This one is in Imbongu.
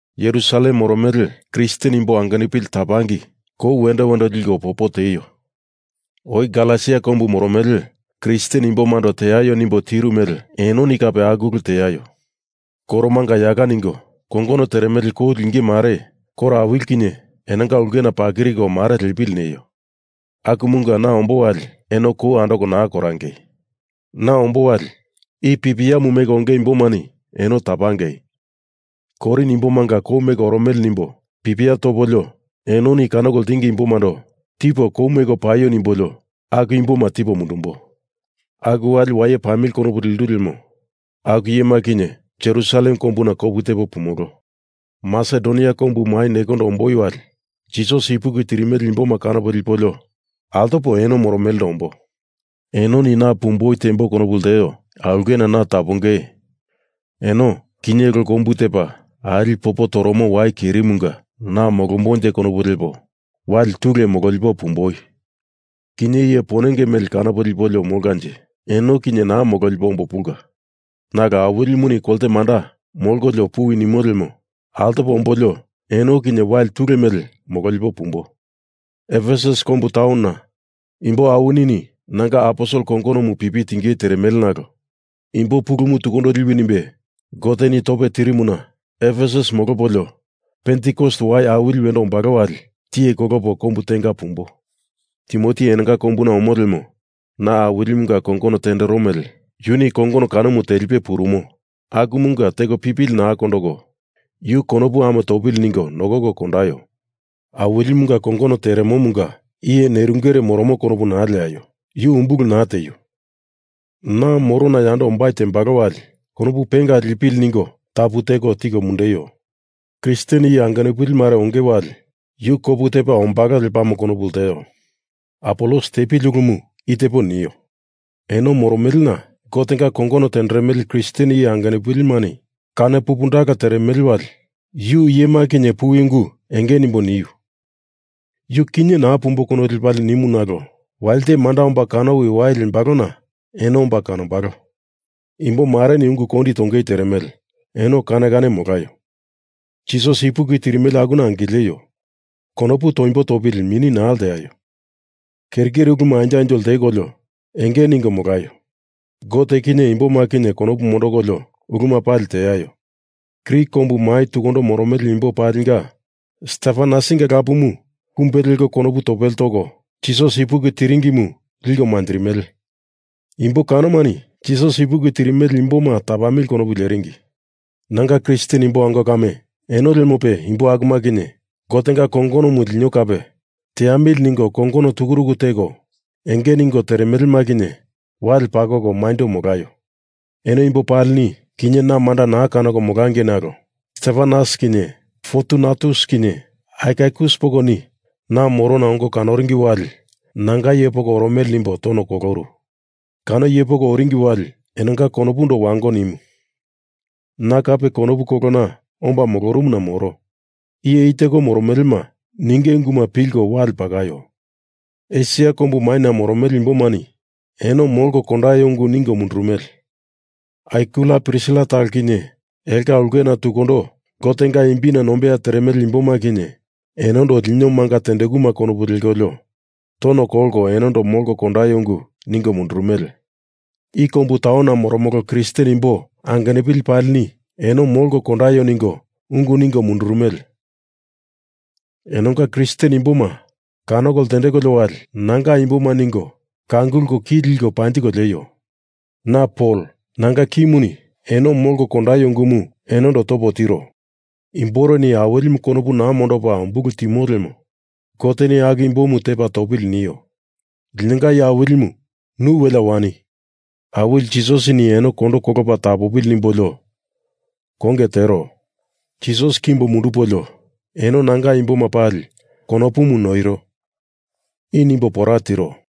Jerusalem moromele Kristen imbo angenupili tapangei kou wendo wendo liko popo tieio. Oi Galesia kombu moromele Kristen imbomando teaio nimbo tiru mele enoni kape aku ulu teaio. Koromanga yaka ningo kongono teremele kou linge mare koro awili kinye enonga ulkena pakiriko mare lepili neio. Akumunga na ombo wali eno kou naa andoko korangei. Na ombo wali i pipiamu meko onge imbomani eno tapangei Korin imbomanga kou meko oromele nimbo pipia topolio enoni kanoko ltingi imbomando tipo kou meko paio nimbolio aku imboma tipo mundumbo. Aku wali waye pamili konopu lendu lemo aku iyema kinye Jerusalem kombuna kopu tepo pumolo. Masedonia kombu mai nekondo omboi wali Jisas ipuki tirimele imboma kanopo lipolio altopo eno moromelendo ombo. Enoni na pumboi tembo konopu lteo aulkena tapongei eno kinye lo kombu tepa ali popo toromo wai kerimunga na molombonje konopu lepo wai tule mololipo pumboi. Kinye iye ponenge mele kanopo lipolio molkanje eno kinye naa mololipo ombo pulka. Nalo Awilimuni kolte manda molkolio puwi nimo lemo altopo ombolio eno kinye wali tule mele mololipo pumbo. Efesus kombu taunona imbo awinini nanga aposel kongonomu pipi tingei teremele nalo imbo pulumu tukundo liwi nimbe Goteni tope tirimuna Efesus molopolio Pentikos Wai Awili wendo ombalo wali tiye kolopo kombu tenga pumbo. Timoti enonga kombuna omo lemo na Awilimunga kongono tendero mele yuni kongono kanomu telipe purumo akumunga teko pipili naa kondoko yu konopu ame topa molopili ningo nokoko kondaio. Awilimunga kongono teremomunga iye nerungere moromo konopu naa lekolio, yu umbulu naa tieio. Na morona yando ombai tembalo wali konopu penga lipili ningo tapu teko tiko mundeio. Kristen iye angenupili mare onge wali yu kopu tepa ombalo lepamo konopu lteo. Apolos tepili ulumu i tepo nio. Eno moromelena Gotenga kongono tenderemele Kristen iye angenupilini kano pupundala teremele wali yu iyema kinye puwi ungu enge nimbo niu. Yu kinye naa pumboi konopu lepalie nimu nalo walite manda omba kanowi wai lembalona eno omba kanombalo. Imbomareni ungu kondi tongei teremele eno kane kane molaio. Jisas ipuki tirimele akuna angileio. Konopu toimbo topili mini naa leaio. Keri keri uluma anjo anjo lteko enge ningo molaio. Gote kinye imboma kinye konopu mondokolio uluma pali teaio. Grik kombu mai tukundo moromele imbo palinga Stefanasinga lapumu kumbe leko konopu topele toko Jisas ipuki tiringimu liko manjirimele. Imbo kanomani Jisas ipuki tirimele imboma tapamili konopu leringi. Nanga Kristen imbo ango kame, eno lemope imbo akuma kinye Gotenga kongonomu lino kape teamili ningo kongono tukuruku teko enge ningo teremelema kinye wale pakoko maindo molaio. Eno imbo palini kinye na manda naa kanoko molangei nalo Stefanas kinye Fortunatus kinye Akaikus pokoni na morona ongo kanoringi wali nanga iye poko oromele nimbo tono koloru. Kano iye poko oringi wali enonga konopundo wango nimu. Na kape konopu kolona omba molorumuna moro. Iye i teko moromelema ninge unguma pilko wale pakaio. Esia kombu maina moromele imbomani eno molko kondaio ungu ningo mundurumele. Akwila Prisila talo kinye elonga ulkena tukundo Gotenga imbina nombeya teremele imboma kinye enondo lino manga tendekuma konopu lekolio tono kolko eno molko kondaio ungu ningo mundurumele. I kombu taunona moromolo Kristen imbo angenupili palini eno molko kondaio ningo ungu ningo mundurumele. Enonga Kristen imboma kanoko ltendekolio wali nanga imboma ningo kangulko ki liko panjiko lieio. Na Pol, nanga kimuni eno molko kondaio ungumu enondo topo tiro. Imboreni Awilimu konopu naa mondopa umbulu timo lemo Goteni aku imbomu tepa topili nio. Linonga Iye Awilimu, nu welea wani! Awili Jisasini eno kondo kolopa tapopili nimbolio konge tero. Jisas kimbo mundupolio eno nanga imboma pali konopumu noiro. I nimbo pora tiro.